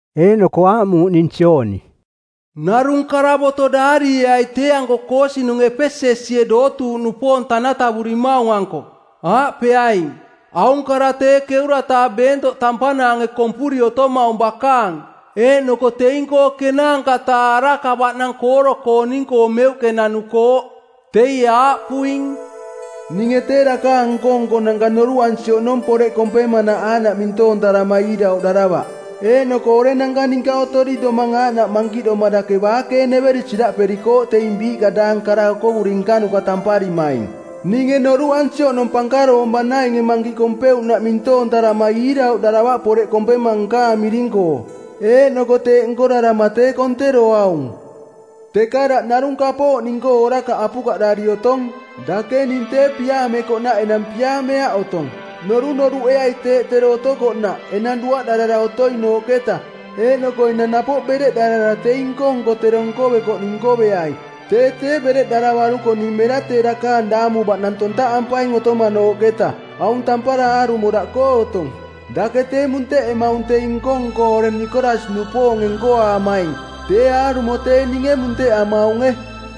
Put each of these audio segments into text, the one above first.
Eeꞌnoko aaꞌmuuꞌ ning Jooni, “Narung karavoto daarieai tee-anko koosinung Epesesie dootuuꞌnupoong tanatavurimaung-anko. Aaꞌpeaing, ‘Aung kara tee ˜keura-taa beentoꞌ tampanaange kompuri otomaung bakaang eeꞌnoko teing-koo ˜kenaanka-taa araka baꞌnang kooro-kooning-koo meuꞌke nanukooꞌ. Teie aaꞌpuing, “Ninge tee dakaang nko-nkonanka noruꞌansi oꞌnong poreꞌ kompemanaꞌ aaꞌnaꞌ mintoontarama iirauꞌdaravaꞌ. Eeꞌnoko orenanka ninka otori domang aaꞌnaꞌ mankiꞌdoma dake baakeeneveri siraꞌperikooꞌ teing biiꞌka daang kara okovuri nkanuka tamparimaing. Ninge noruꞌansi oꞌnong pankaroong banainge mankiꞌ kompeuꞌnaꞌ mintoontarama iirauꞌdaravaꞌ poreꞌ kompema nkaang miring-koo, eeꞌnoko teeꞌ nkorarama tee konteroaung. Teka daꞌ narung kapooꞌ ning-koo orakaꞌ apukaꞌdari otong, dake ning tee piaamekoꞌnaꞌ enang piaameaꞌ otong. Norunoruꞌeai teeꞌ tero otokoꞌnaꞌ enang duaꞌdarara otoinooꞌketa eeꞌnoko enang napoꞌ bereꞌdarara teing nko-nko tero nkovekoꞌning nkoveai. Tee tee bereꞌdaravaruko ning mera tee dakaang daamu baꞌnang tontaꞌampaing otomanooꞌketa. Aung tampara aarumo daꞌkoo otong, dake tee munteꞌemaung teing nko-nko oreng Nikolas-nupoonge nkoaamaing, tee aarumo tee ninge munteꞌamaunge.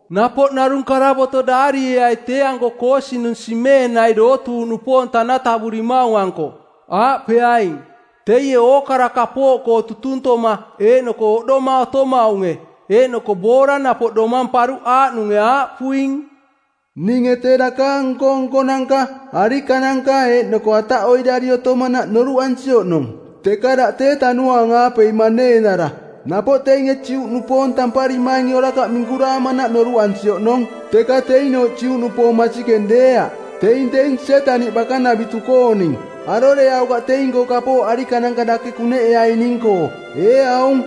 “Napoꞌ narung karavoto daarieai tee-anko koosinung Simeenai dootuuꞌnupoong tanatavurimaung-anko. Aaꞌpeaing, ‘Teie ookara kapooꞌkoo tutuntoma eeꞌnoko oꞌdoma otomaunge, eeꞌnoko boora napoꞌ domamparuꞌ aaꞌnunge aaꞌpuing, “Ninge tee dakaang nko-nkonanka, arikananka eeꞌnoko ataꞌoiꞌdari otomanaꞌ noruꞌansi oꞌnong, teka daꞌ tee tanuaang-aape maneenara. Napoꞌ teinge Juꞌnupoong tamparimainge orakaꞌ minkuraamanaꞌ noruꞌansi oꞌnong, teka teinooꞌ Juꞌnupoong masikeng deeaꞌ. Teing teing Sietaniꞌ bakanavitu-kooning. Aroreaukaꞌ teing-koo kapooꞌ arikananka dake kuneꞌeaining-koo. Ee aung,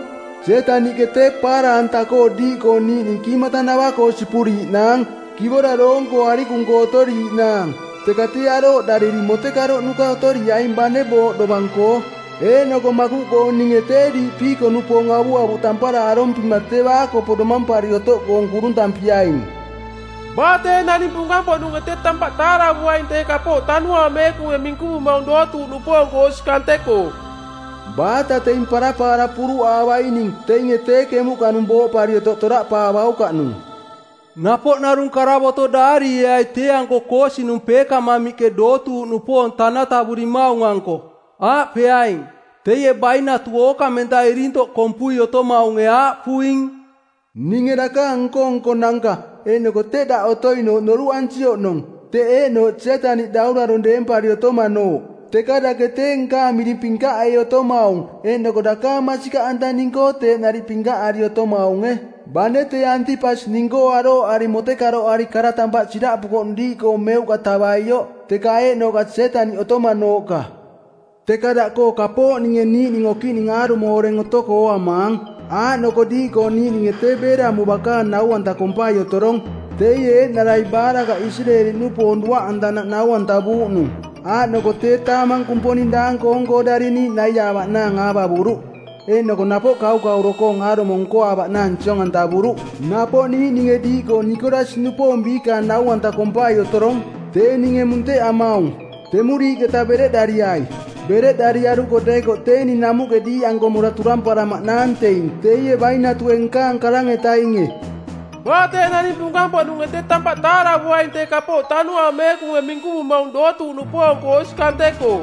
Sietaniꞌke tee paara-anta-koo diiꞌkoo niiꞌning kiimatanava-koo sipuriiꞌnaang, kivora doong-koo arikung-koo otoriiꞌnaang, teka tee arooꞌdariri motekaroꞌnuka otoriaing bane booꞌ dovang-koo, eeꞌnoko makuꞌkoo ninge tee diiꞌ piiko-nupoong avuavuꞌ tampara arompima tee baakopo domampari otoꞌkoong kuruntampiaing. Baa tee naning punkang-poꞌnunge tee tampaꞌ taaravuaing tee kapooꞌ Tanuaang Meekunge minkuvumaung dootuuꞌnupoong-koo osi kante-koo. Baata teing parapaara puruꞌaavaining teinge tee kemuꞌkanung booꞌpari otoꞌ toraꞌpaavaukaꞌnung.”’” “Napoꞌ narung karavoto daarieai tee-anko koosinung Peekamamiꞌke dootuuꞌnupoong tanatavurimaung-anko. Aaꞌpeaing, ‘Teie bainatu ookamenta irintoꞌ kompui otomaunge aaꞌpuing, “Ninge dakaang nko-nkonanka eeꞌnoko teꞌ daꞌ otoinooꞌ noruꞌansi oꞌnong, teꞌ eeꞌnooꞌ Sietaniꞌ daurarong˜ deempari otomanooꞌ. Teka dake tee nkaang miring pinkaꞌei otomaung eeꞌnoko dakaang masikaꞌanta ning-koo teeꞌ nariꞌ pinkaꞌari otomaunge, bane tee Antipas ning-koo arooꞌari motekaroꞌari kara tampaꞌ siraꞌpukoꞌnung diiꞌkoo meuꞌka tavaioꞌ teka eeꞌnooꞌka Sietaniꞌ otomanooꞌka. Teka daꞌkoo kapooꞌ ninge niiꞌning okiꞌning aarumo oreng otoko ooamaang, aaꞌnoko diiꞌkoo niiꞌninge tee Beelamu bakaang nau-anta kompai otorong, teie eeꞌnarai Baalakaꞌ Isireeli-nupoong duaꞌantanaꞌ nau-antavuuꞌnung. Aaꞌnoko tee taamang kumponing daang-koong-koo dariniiꞌ naiaavaꞌnaang aavavuruꞌ, eeꞌnoko napoꞌ kaukauro-koong aarumo nkoaavaꞌnaang siong-antavuruꞌ. Napoꞌ niiꞌninge diiꞌkoo Nikolas-nupoong biikaang nau-anta kompai otorong, tee ninge munteꞌamaung. Temuriiꞌketa bereꞌdariai. Bereꞌdariaruko deekoꞌ tee ning namuꞌke diiꞌanko mora turamparamaꞌnaang teing teie bainatue nkaang karang-etainge. Baa tee naning punkang-poꞌnunge tee tampaꞌ taaravuaing tee kapooꞌ Tanuaang Meekunge minkuvumaung dootuuꞌnupoong-koo osi kante-koo.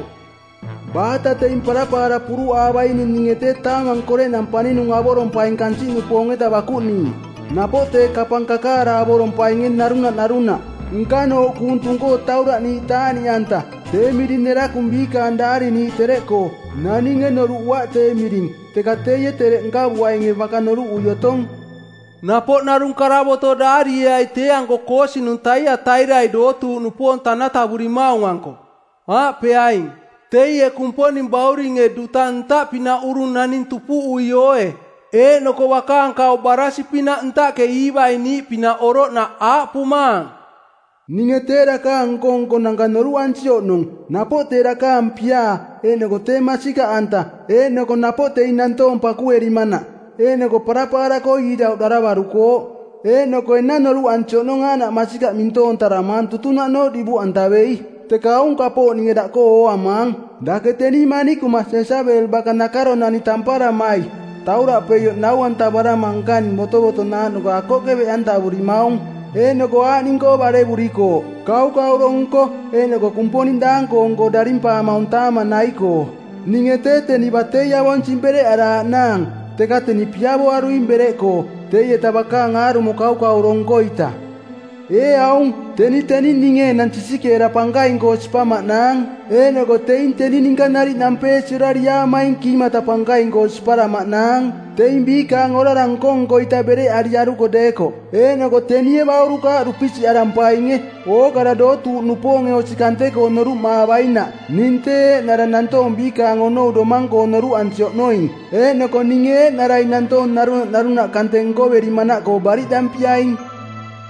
Baata teing parapaara puruꞌaavaining ninge tee taamang koreꞌnang paninung avorompaing kansiꞌnupoong-eta bakuꞌniiꞌ, napoꞌ tee kapang kakaara avorompainge narunaꞌ narunaꞌ, nkanooꞌ kuung tung-koo tauraꞌniiꞌ taaꞌniꞌanta, tee miring nerakung biikaang daariniiꞌ tereꞌkoo. Naninge noruꞌuaꞌ tee miring, teka teie tereꞌ nkavuainge baka noruꞌui otong.”’” “Napoꞌ narung karavoto daarieai tee-anko koosinung Taiatairai dootuuꞌnupoong tanatavurimaung-anko. Aaꞌpeaing, ‘Teie Kumponing Bauringe duta ntaꞌpinaꞌ urung naning tupuꞌui ooe, eeꞌnoko bakaang kauꞌ baraasi˜pinaꞌ ntaꞌke iivaiꞌniiꞌ pinaꞌ oroꞌnaꞌ aaꞌpumaang, “Ninge tee dakaang nko-nkonanka noruꞌansi oꞌnong, napoꞌ tee dakaang piaa eeꞌnoko tee masikaꞌanta eeꞌnoko napoꞌ teing nantoong pakuerimanaꞌ. Eeꞌnoko parapaara-koo iirauꞌdaravarukooꞌ, eeꞌnoko enang noruꞌansi oꞌnong aaꞌnaꞌ masikaꞌ mintoontaramaang tutunaꞌnooꞌ divuꞌantavei. Teka aung kapooꞌ ninge daꞌkoo ooamaang, dake teni manikuma Jesabel baka nakaronani˜ tamparamai tauraꞌpeioꞌ nau-antavarama nkaning botovotonaaꞌnuka akoꞌke beꞌantavurimaung. Eeꞌnoko aaꞌning-koo barevurikooꞌ: kaukauro nko eeꞌnoko kumponing daang-koong-koo darimpaamaung taamang nai-koo. Ninge tee teni batei avonsing bereꞌaraaꞌnaang, teka teni piavoaruing bereꞌkoo, teieta bakaang aarumo kaukauro nko-ita. Ee aung, teni teni ninge enang sisikeera pankaing-koo sipamaꞌnaang eeꞌnoko teing teni ninka nariꞌ nampeesi orariaamaing kiimata pankaing-koo siparamaꞌnaang, teing biikaang orara nko-nko-ita bereꞌariaruko deekoꞌ. Eeꞌnoko tenie baurukaaꞌ dupisiꞌarampainge, ookara dootuuꞌnupoonge osi kante-koo noruꞌmaavainaꞌ ning tee eeꞌnara nantoong biikaang onou domang-koo noruꞌansi oꞌnoing. Eeꞌnoko ninge eeꞌnarai nantoong narunaꞌ narunaꞌ kante nkoverimanaꞌkoo bariꞌdampiaing.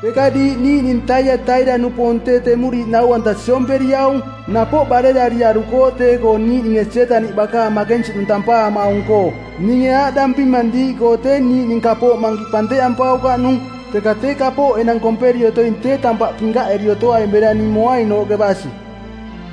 Teka diiꞌ niiꞌning Taiataira-nupoong tee temuriiꞌ nau-anta siomperiaung, napoꞌ barerariarukooꞌ tee-koo niiꞌninge Sietaniꞌ bakaang makensiꞌnung tampaamaung-koo. Ninge aaꞌdampimang diiꞌkoo tee niiꞌning kapooꞌ mankiꞌ panteꞌampaukaꞌnung. Teka tee kapooꞌ enang komperi otoing tee tampaꞌ pinkaꞌeri otoaing bera ning moainooꞌke basi.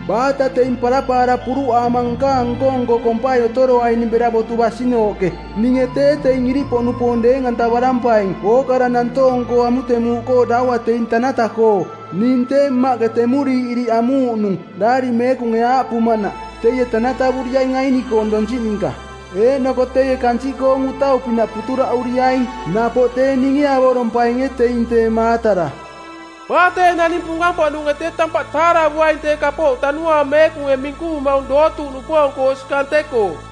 Baata teing parapaara puruꞌaama nkaang nko-nko kompai otoroaining bera botu basinooꞌke, ninge tee teing iriꞌpoꞌnupoong deeng-antavarampaing ookara nantoong-koo amutemuuꞌkoo daua teing tanata-koo. Ning tee Mmaꞌke temuriiꞌ iriꞌ amuuꞌnung Daari Meekunge aaꞌpumanaꞌ, ‘Teie tanatavuriaing aini-koong ninka donsiꞌ ninka. Eeꞌnoko teie kansiꞌkoong utau-pinaꞌ puturaꞌuriaing.’ Napoꞌ tee ninge avorompainge teing tee maatara. Baa tee naning punkang-poꞌnunge tee tampaꞌ taaravuaing tee kapooꞌ Tanuaang Meekunge minkuvumaung dootuuꞌnupoong-koo osi kante-koo.”’”